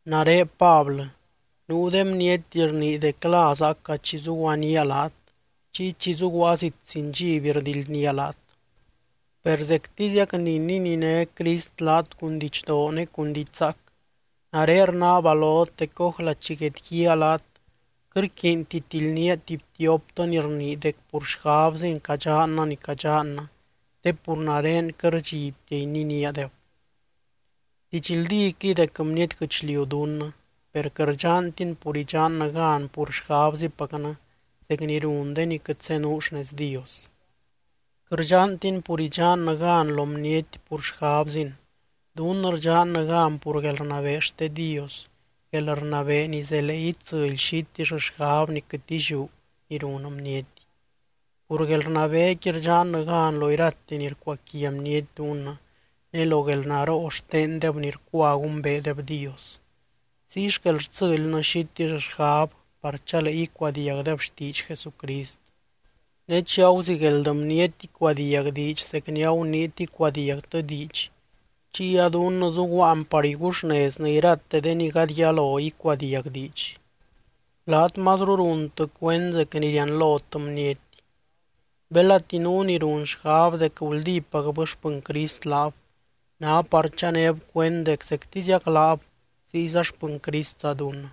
Nare Pablɨ, nuu de bniety rnii dec la zaaca chi zuguaníaa laat, chiy chi zuguaa zit sin dxiby rdildnía laat. Per zectiziac ni nininé Crist laat cun didxdoo ne cun diidx zaac, nare rnaaba lot dec ójla chi guedguíaa laat quɨt rquiinti tildnía tuby tioptɨ ni rnii dec pur xgabzin cadxannɨ ni cadxannɨ, te pur nare quɨt rdxibtia ininíadeb. Didxldíquɨy dec bniety guɨchliu dunnɨ, per quɨt rdxantin pur idxannɨ gan pur xgabzipacnɨ zec ni run de ni quɨt zenuu xnez Dios. Quɨt rdxantin pur idxannɨ gan lo bniety pur xgabzin, dunnɨ rdxannɨ gan pur guelrnabee xte Dios, guelrnabee ni zelee itsɨly xitill xgab ni quɨt illiú ni run bniety. Pur guelrnabeequi rdxannɨ gan lo irate ni rcuaquia bniety dunnɨ, ne lo guelnaroo xtendeb ni rcua gumbeedeb Dios. Ziy xquel rtsɨlynɨ xitill xgab par chalee icuadiagdeb xtiidx Jesucrist. Ne chi aguzigueld bniety icuadiag diidx zec ni aguniit icuadiagtɨ diidx, chiy a dunnɨ zuguaan par iguxneznɨ irate de ni gady yalo icuadiag diidx. Laat mazru runtɨ cuend zec ni rianlot bniety. Belati nuu ni run xgab dec guldípacbɨ xpɨny Crist laab, ná par chanéb cuend dec zectiziac laab, ziyza xpɨny Cristza dunnɨ.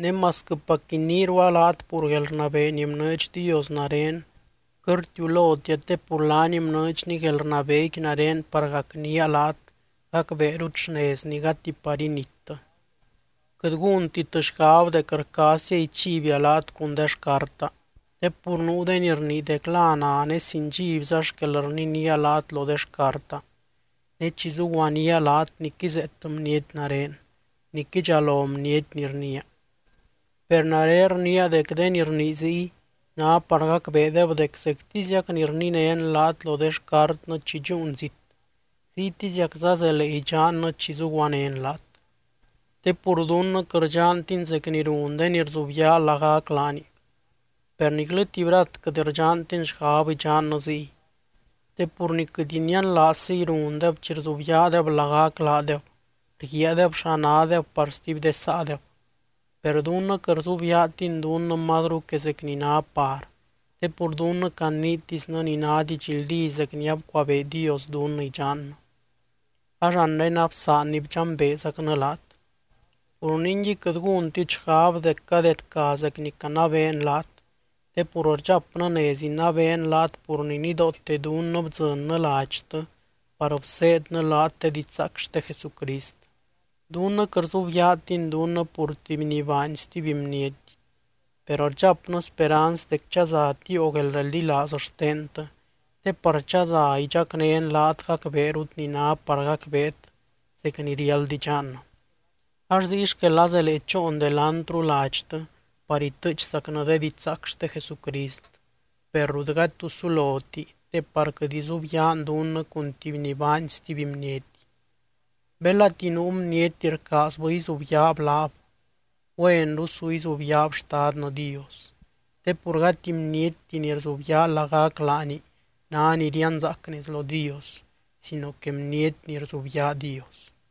Ne masquɨpac iniirua laat pur guelrnabee ni bnɨɨdx Dios nare, quɨt rtiulotia te pur laany bnɨɨdxny guelrnabeequi nare par gacnía laat gacbeerut xnezny gati par inittɨ. Quɨt gúntit xgab dec rcaazzia ichibia laat cun de xcarta. Te pur nuu de ni rnii dec la na ne sin dxibza xquel rninía laat lo de xcarta, ne chi zuguaníaa laat nic izeet bniety nare, nic idxalo bniety ni rniia. Per nare rniia dec de ni rnii ziy ná par gacbeedeb dec zectiziac ni rninén laat lo de xcartnɨ chi dxúun zit, ziytiziacza zelee idxannɨ chi zuguanén laat. Te pur dunnɨ quɨt rdxantin zec ni run de ni rzubyaa lagac laani, per niclɨ tuby rat quɨt rdxantin xgab idxannɨ ziy. Te pur ni quɨt inianlaazziy rundeb chi rzubyaadeb lagac laadeb, rguiaadeb xa nádeb par stuby de saadeb. Per dunnɨ quɨt rzubyaatin dunnɨ mazru que zec ni ná par, te pur dunnɨ caniitisnɨ ni ná didxldí zec ni abcuabee Dios dunnɨ idxannɨ, ax anre absaanny bdxambeezacnɨ laat. Pur ningui quɨt gúntit xgab dec cadedca zec ni canabeen laat, te pur rdxapnɨ nez inabeen laat pur ni nidoote dunnɨ bdzɨnnɨ ladxtɨ par bseednɨ laat de didxzaac xte Jesucrist. Dunnɨ quɨt rzubyaatin dunnɨ pur tuby ni baany stuby bniety. Per rdxapnɨ speranz dec chaza tiio guelreldilaaz xtentɨ, te par chaza idxacnén laat gacbeerut ni ná par gacbeet, zec ni riáld idxannɨ. Ax ziy xquel azelee choon delantru ladxtɨ par itɨɨchzacnɨ de didxzaac xte Jesucrist, per rut gady tu suloti te par quɨt izubyaan dunnɨ cun tuby ni baany stuby bniety. Belati nuu bniety rcaazbɨ izubyaab laab, güenru su izubyaab Xtadnɨ Dios. Te pur gati bnietti ni rzubyaa lagac laani ná ni rianzaac nez lo Dios, sino que bniety ni rzubyaa Dios.